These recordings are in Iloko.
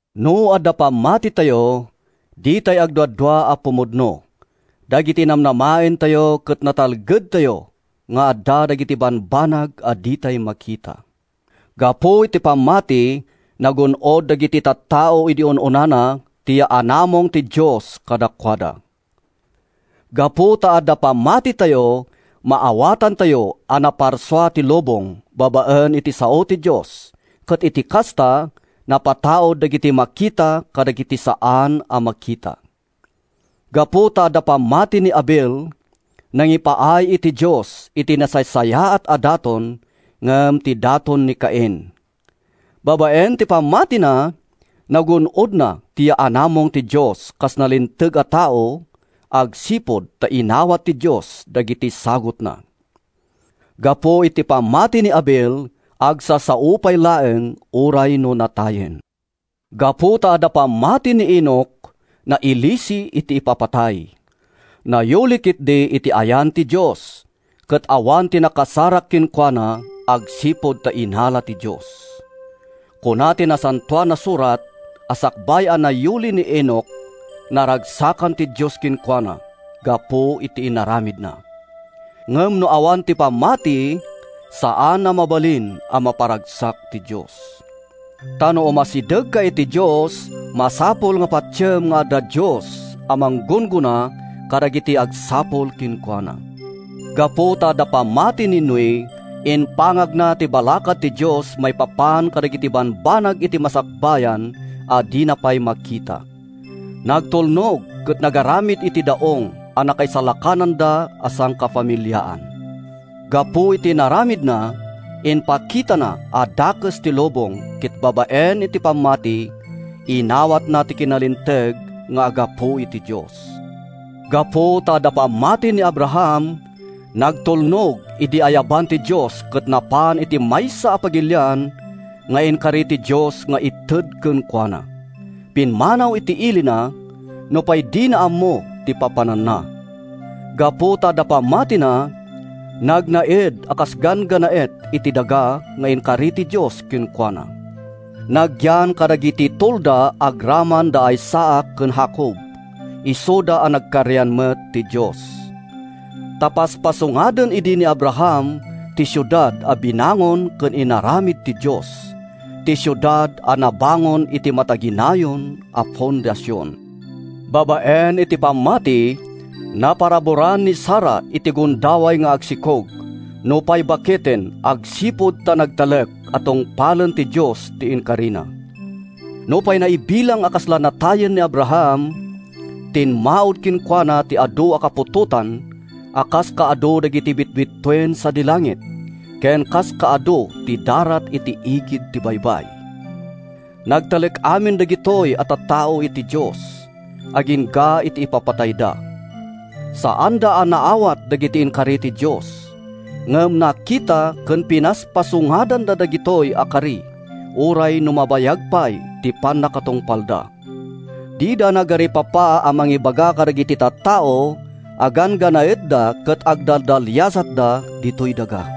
No adda pammatitayo, ditay agduadua a pumudno dagiti namnamaentayo ket natalgedtayo nga adda dagiti bambanag a ditay makita. Gapu iti pammati, nagun-od dagiti tattao idi un-unana ti yaanamong ti Dios kadakuada. Gapu ta adda pammatitayo, maawatantayo a naparsua ti lubong babaen iti sao ti Dios ket iti kasta, napataud dagiti makita kadagiti saan a makita. Gapu ta adda pammati ni Abel, nangipaay iti Dios iti nasaysayaat a daton ngem ti daton ni Cain. Babaen iti pammatina, nagun-odna ti yaanamong ti Dios kas nalinteg a tao agsipud ta inawat ti Dios dagiti sagutna. Gapu iti pammati ni Abel, agsasao pay laeng uray no natayen. Gapu ta adda pammati ni Enoc, nailisi iti ipapatay. Nayuli ketdi iti ayan ti Dios, ket awan ti nakasarak kenkuana agsipud ta innala ti Dios. Kuna ti Nasantoan a Surat a sakbay a nayuli ni Enoc, naragsakan ti Dios kenkuana gapu iti inaramidna. Ngem no awan ti pammati, saan a mabalin a maparagsak ti Dios. Ta no umasidegka iti Dios, masapul a patiem nga adda Dios a manggunggona kadagiti agsapul kenkuana. Gapu ta adda pammati ni Noe, impangagna ti balakad ti Dios maipapan kadagiti bambanag iti masakbayan a dina pay makita. Nagtulnog ket nangaramid iti daong a nakaisalakananda a sangafamiliaan. Gapu iti inaramidna, impakitana a dakes ti lubong ket babaen iti pammati, inawatna ti kinalinteg nga aggapu iti Dios. Gapu ta adda pammati ni Abraham, nagtulnog idi ayaban ti Dios ket napan iti maysa a pagilian nga inkari ti Dios nga ited kenkuana. Pimmanaw iti ilina, nupay dina ammo ti papananna. Gapu ta adda pammatina, nagnaed a kas ganggannaet iti daga nga inkari ti Dios kenkuana. Nagyan kadagiti tolda agraman da Isaac ken Jacob, isuda a nagkarian met ti Dios. Ta paspasungaden idi ni Abraham ti siudad a binangon ken inaramid ti Dios—ti siudad a nabangon iti mataginayon a fondasion. Babaen iti pammati, naparaburan ni Sara iti gundaway nga agsikog nupay baketen agsipud ta nagtalek a tungpalen ti Dios ti inkarina. Nupay naibilang a kasla natayen ni Abraham, timmaud kenkuana ti adu a kaputotan a kas kaadu dagiti bitbituen sadi langit ken kas kaadu ti darat iti igid ti baybay. Nagtalek amin dagitoy a tattao iti Dios agingga iti ipapatayda. Saanda a naawat dagiti inkari ti Dios, ngem nakita ken pinaspasungadanda dagitoy a kari uray no mabayag pay ti pannakatungpalda. Dida nagaripapa a mangibaga kadagiti tattao a ganggannaetda ket agdaldaliasatda ditoy daga.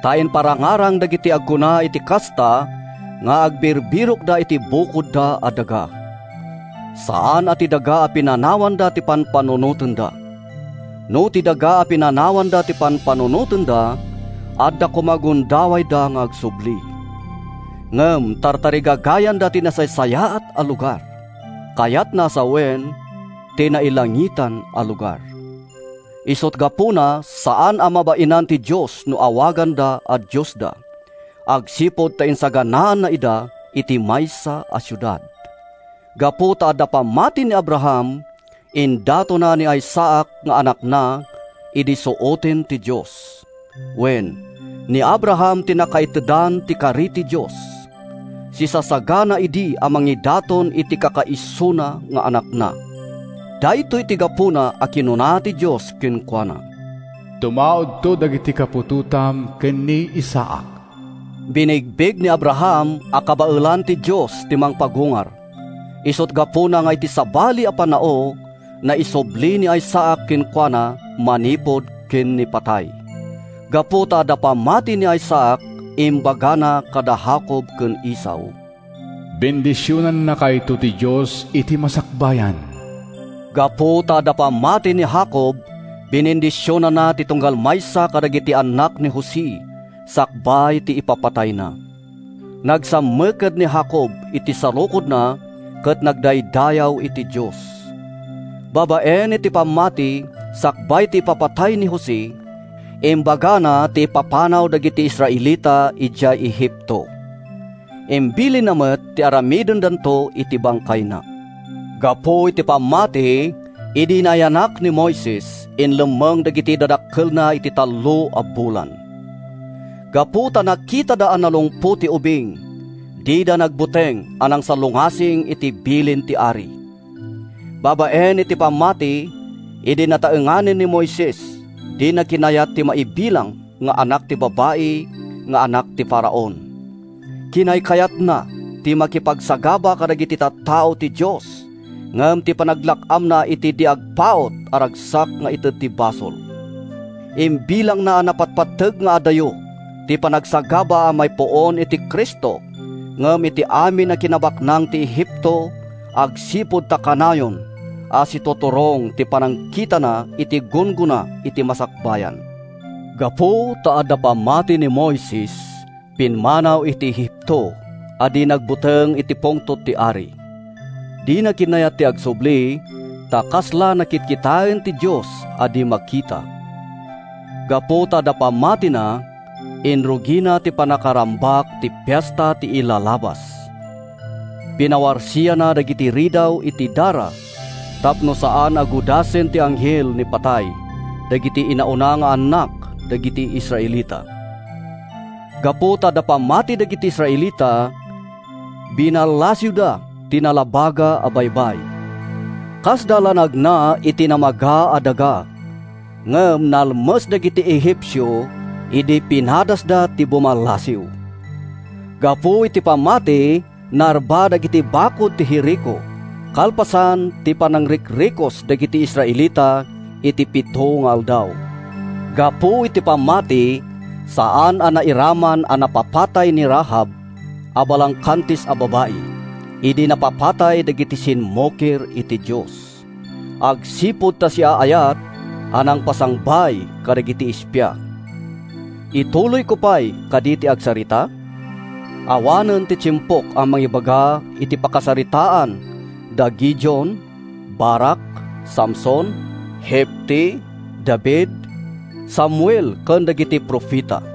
Ta iparangarang dagiti agkuna iti kasta nga agbirbirokda iti bukodda a daga. Saan a ti daga a pinanawanda ti pampanunotenda. No ti daga a pinanawanda ti pampanunotenda, adda koma gundawayda nga agsubli. Ngem tartarigagayanda ti nasaysayaat a lugar, kayatna a sawen, ti nailangitan a lugar. Isut’ gapuna a saan a mabainan ti Dios no awaganda a Diosda agsipud ta insaganaanna ida iti maysa a siudad. Gapu ta adda pammati ni Abraham, indatonna ni Isaac nga anakna idi suoten ti Dios. Wen, ni Abraham ti nakaitedan ti kari ti Dios. Sisasagana idi a mangidaton iti kakaisuna nga anakna. Daytoy ti gapuna a kinuna ti Dios kenkuana, “Tumaudto dagiti kaputotam ken ni Isaac.” Binigbig ni Abraham a kabaelan ti Dios ti mangpagungar, isut’ gapuna nga iti sabali a pannao, naisubli ni Isaac kenkuana manipud ken ni patay. Gapu ta adda pammati ni Isaac, imbagana kada Jacob ken Esau, “Bendisionannakayto ti Dios iti masakbayan.” Gapu ta adda pammati ni Jacob, binendisionanna ti tunggal maysa kadagiti annak ni Jose sakbay ti ipapatayna. Nagsammaked ni Jacob iti sarukodna ket nagdaydayaw iti Dios. Babaen iti pammati, sakbay ti ipapatay ni Jose, imbagana ti ipapanaw dagiti Israelita idiay Egipto. Imbilinna met ti aramidendanto iti bangkayna. Gapu iti pammati, idi nayanak ni Moises, inlemmeng dagiti dadakkelna iti tallo a bulan. Gapu ta nakitada a nalungpo ti ubing, dida nagbuteng a nangsalungasing iti bilin ti ari. Babaen iti pammati, idi nataenganen ni Moises, dina kinayat ti maibilang nga anak ti babai nga anak ti Faraon. Kinaykayatna ti makipagsagaba kadagiti tattao ti Dios ngem ti panaglak-amna iti di agpaut a ragsak nga ited ti basol. Imbilangna a napatpateg nga adayo ti panagsagaba a maipuon iti Cristo ngem ti amin a kinabaknang ti Egipto agsipud ta kanayon a situturong ti panagkitana iti gunggona iti masakbayan. Gapu ta adda pammati ni Moises, pimmanaw iti Egipto a di nagbuteng iti pungtot ti ari. Dina kinayat ti agsubli ta kasna la kitkitaen ti Dios a di makita. Gapu ta adda pammatina, inrugina ti pannakarambak ti Fiesta ti Ilalabas. Pinawarsianna dagiti ridaw iti dara tapno saan a gudasen ti Anghel ni Patay dagiti inauna nga annak dagiti Israelita. Gapu ta adda pammati dagiti Israelita, binallasiwda ti Nalabaga a Baybay. Kasda la nagna iti namaga a daga, ngem nalmes dagiti Egipcio idi pinadasda ti bumallasiw. Gapu iti pammati, narba dagiti bakud ti Jerico, kalpasan ti panangrikrikos dagiti Israelita iti pito nga aldaw. Gapu iti pammati, saan a nairaman a napapatay ni Rahab a balangkantis a babai idi napapatay dagiti simmukir iti Dios, agsipud ta siaayat a nangpasangbay kadagiti espia. Ituloyko pay kadi ti agsarita? Awanen ti tiempok a mangibaga iti pakasaritaan da Gideon, Barac, Samson, Jefte, David, Samuel ken dagiti profeta.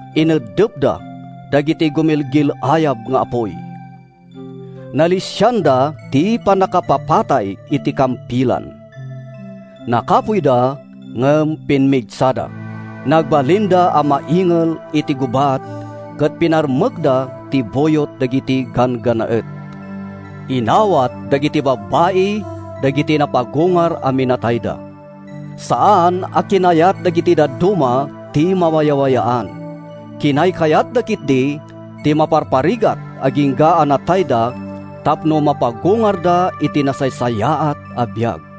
Iniddepda dagiti gumilgil-ayab nga apuy. Nalisianda ti pannakapapatay iti kampilan. Nakapuyda ngem pimmigsada. Nagbalinda a maingel iti gubat ket pinarmekda ti buyot dagiti ganggannaet. Inawat dagiti babbai dagiti napagungar a minatayda. Saan a kinayat dagiti dadduma ti mawayawayaan. Kinaykayatda ketdi ti maparparigat agingga a natayda tapno mapagungarda iti nasaysayaat a biag.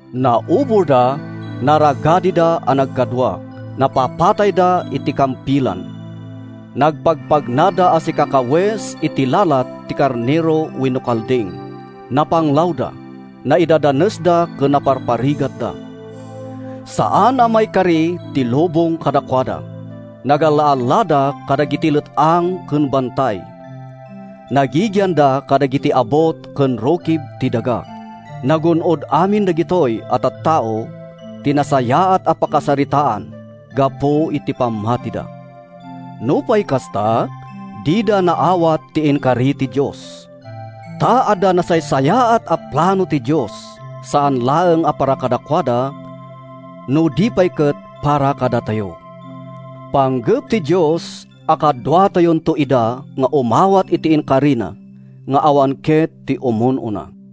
Nauborda, naragadida a nagkadua, napapatayda iti kampilan. Nagpagnapagnada a sikakawes iti lalat ti karnero wenno kalding. Napanglawda, naidadanesda ken naparparigatda. Saan a maikari ti lubong kadakuada! Nagalla-allada kadagiti let-ang ken bantay. Nagigianda kadagiti abut ken rukib ti daga. Nagun-od amin dagitoy a tattao ti nasayaat a pakasaritaan gapu iti pammatida! Nupay kasta, dida naawat ti inkari ti Dios, ta adda nasaysayaat a plano ti Dios saan laeng a para kadakuada no di pay ket para kadatayo. Panggep ti Dios a kaduatayonto ida nga umawat iti inkarina nga awan ket ti umun-una.